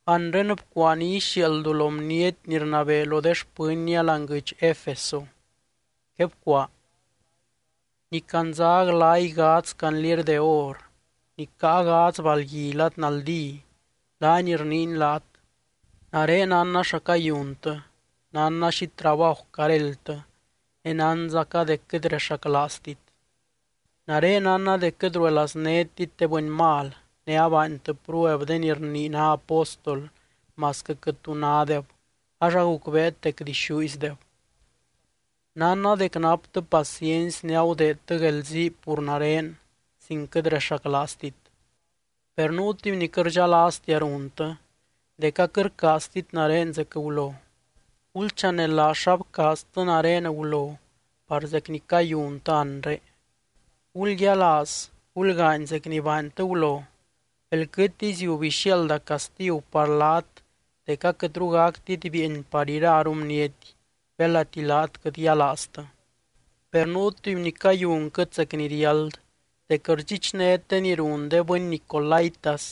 ’Anre bcuaa ni ixiaaldu lo bniety ni rnabee lo de xpɨnnia láani guɨdx Efeso. Quebcuaa: “Ni candza glay gadz candliery de or, ni caa gadz balgui lad naldí, laany rniiny laat: Nare nánna xa cayuntɨ. Nánna xi trabaju caréldtɨ, ne nánzaca dec quɨt rexaclaaztit. Nare nánna dec quɨt ruelaaznétit de bɨny mal, ne abaantɨ prueb de ni rnii ná apóstol masquɨ quɨt tu nádeb ax agucbeet dec dixúizdeb. Nánna dec naptɨ paciency ne agudeedtɨ guelzii pur nare sin quɨt rexaclaaztit. Per nuu tuby ni quɨt rdxalaaztia runtɨ, dec aquɨt rcaaztit nare zec gulo. Gulchanelaaz xa bcaaztɨ nare gulo par zec ni cayuntɨ anre. Gulyialaaz, gulgaany zec ni baantɨ gulo, belquɨtiy ziub ixiaalda castigu par laat dec aquɨtru gactit bieeny par iraru bniety, belati laat quɨt yialaaztɨ. Per nuu tuby ni cayunquɨt zec ni riáld, dec rdxichnét de ni run de bɨny nicolaítas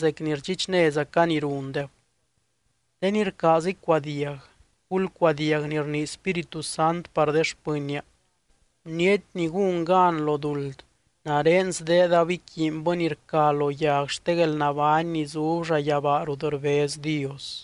zec ni rdxichnézaca ni rundeb. De ni rcaaz icuadiag, gulcuadiag ni rnii Spíritu Sant par de xpɨnnia: Bniety ni gún gan lo duld, nare sdeedab iquiinbɨ ni rca lo yag xte guelnabány ni zub llayabaa rut rbez Dios.”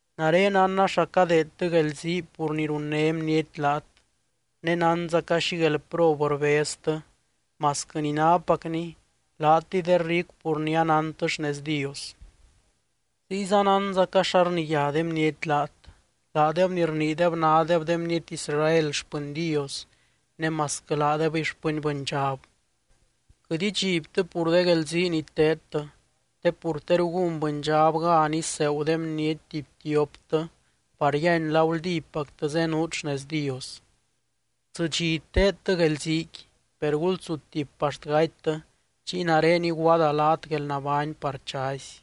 Nare nánna xa cadeedtɨ guelzii pur ni runné bniety laat, ne nánzaca xi guelprob rbeztɨ masquɨ ni nápacni laatɨy de ricu pur ni anántɨ xnez Dios. Ziyza nánzaca xa rniyá de bniety laat, laadeb ni rniideb nádeb de bniety Israel xpɨny Dios ne masquɨ laadebɨy xpɨny bɨndxab. Quɨt idxibtɨ pur de guelzii ni teedtɨ, te pur teru gún bɨndxab gan iseegu de bniety tuby tioptɨ par yíany la guldípactɨ zenuut xnez Dios. Tsɨ dxi teedtɨ guelziiqui, per gulsutip axt gatytɨ, chiy nare iguaada laat guelnabány par chazy.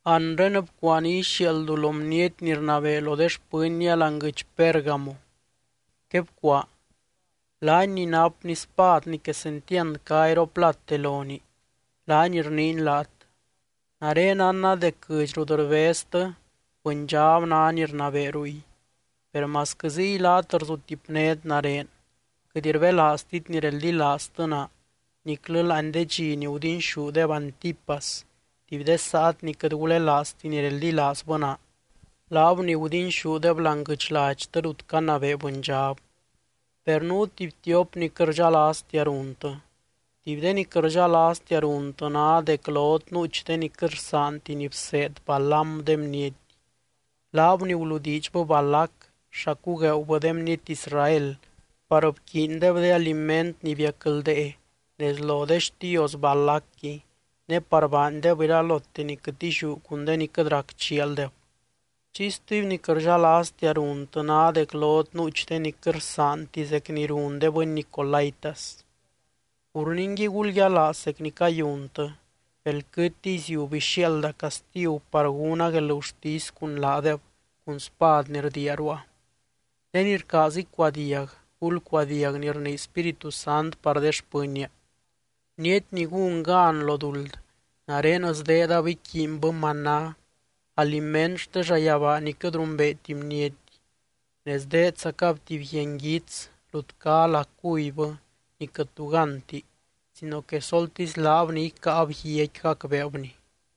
’Anre bcuaa ni ixiaaldu lo bniety ni rnabee lo de xpɨnnia láani guɨdx Pérgamo. Quebcuaa: “Laany ni napny spad ni quesentiand cá iroplate lonii, laany rniiny laat: Nare nánna dec guɨdx rut rbeztɨ bɨndxab ná ni rnabee ruy. Per masquɨ ziy laat rzutipnét nare, quɨt rbelaaztit ni reldilaaztɨ naa niclɨ láani de dxi ni gudinxúdeb Antipas, tuby de saat ni quɨt gulelaazti ni reldilaazbɨ naa, laab ni gudinxúdeb láani guɨdx ladxtɨ rut canabee bɨndxab. Per nuu tuby tiop ni quɨt rdxalaaztia runtɨ. Tuby de ni quɨt rdxalaaztia runtɨ ná dec lot nuuch de ni quɨt rsaanti ni bseed Balaam de bniety, laab ni guludiidxbɨ Balac xa cugueeubɨ de bniety Israel par bquiindeb de aliment ni biacldee nez lo de xtios Balacqui, ne par baandeb iralote ni quɨt illiú cun de ni quɨt rac chialdeb. Chiy stuby ni quɨt rdxalaaztia runtɨ ná dec lot nuuch de ni quɨt rsaanti zec ni run de bɨny nicolaítas. Pur ningui gulyialaaz zec ni cayuntɨ, belquɨtiy ziub ixiaalda castigu par gúna guelgurtisy cun laadeb cun spad ni rdiia ruua. De ni rcaaz icuadiag, gulcuadiag ni rnii Spíritu Sant par de xpɨnnia: Bniety ni gún gan lo duld, nare sdeedab iquiinbɨ maná, aliment xte llayabaa ni quɨt rumbeeti bniety. Ne sdeedzacab tuby guia nguits rut cá lá cubybɨ ni quɨt tu gánti sino que soltisy laab ni icáab guiaqui gacbeebni.”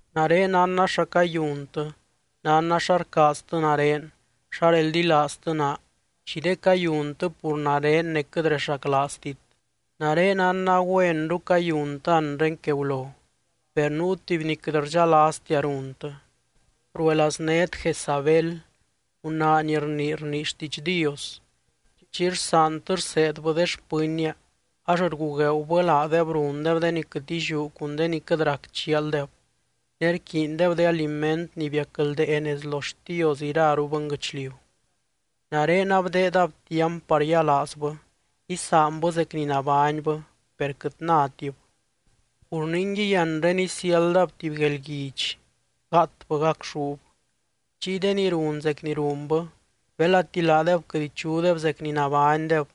Nare nánna xa cayuntɨ, nánna xa rcaaztɨ nare, xa reldilaaztɨ naa, xi de cayuntɨ pur nare ne quɨt rexaclaaztit. Nare nánna güenru cayuntɨ anre que gulo. Per nuu tuby ni quɨt rdxalaaztia runtɨ: Ruelaaznét Jezabel, gunaa ni rnii rnii xtiidx Dios. Chiy rsaantɨ rseedbɨ de xpɨnnia ax rgugueeubɨ laadeb rundeb de ni quɨt illiú cun de ni quɨt rac chialdeb, ne rquiindeb de aliment ni biacldee nez lo de xtios iraru bɨnguɨchliu. Nare abdeedab tiamp par yialaazbɨ, isaanbɨ zec ni nabánybɨ per quɨt nátib. Pur ningui anre isiáldab tuby guelguidx, gáatbɨ gacxúb. Chiy de ni run zec ni runbɨ, belati laadeb quɨt ichudeb zec ni nabánydeb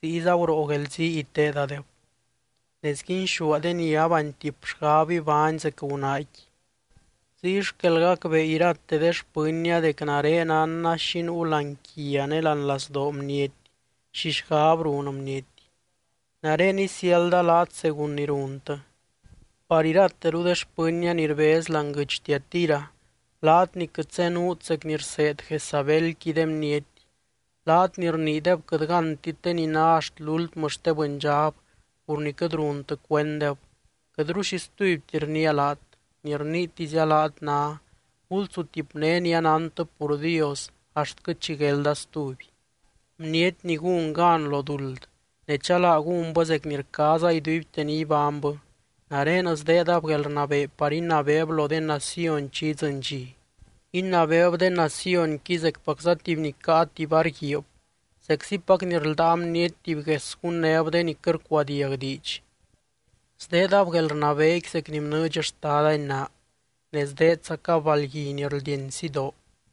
ziyza guroo guelzii iteedadeb, ne sguinxúa de ni abaantip xgab ibány zec gunaaqui. Ziy xquel gacbee irate de xpɨnnia dec nare nánna xi nuu láani quia ne láani lazdoo bniety, xi xgab run bniety. Nare isiálda laat según ni runtɨ. Par irateru de xpɨnnia ni rbez láani guɨdx Tiatira, laat ni quɨt zenuut zec ni rseed Jezabelqui de bniety, laat ni rniideb quɨt gántit de ni ná axt lúltmɨ xte bɨndxab pur ni quɨt runtɨ cuenddeb, quɨtru xi stubyti rniia laat, ni rniitizia laat ná: Gulsutipné ni anántɨ pur Dios axtquɨ chi guelda stuby. Bniety ni gún gan lo duld, ne chalaa gúnbɨ zec ni rcaaza iduibte ni ibánybɨ, nare sdeedab guelrnabee par inabeeb lo de naciony chi idzɨny dxi. Inabeeb de nacionqui zecpacza tuby ni caa tuby var guiib, zeczipac ni rldáa bniety tuby gues gunnéb de ni quɨt rcuadiag diidx. Sdeedab guelrnabeequi zec ni bnɨɨdx Xtadani naa, ne sdeedzacab balgui ni rldieny sidoo.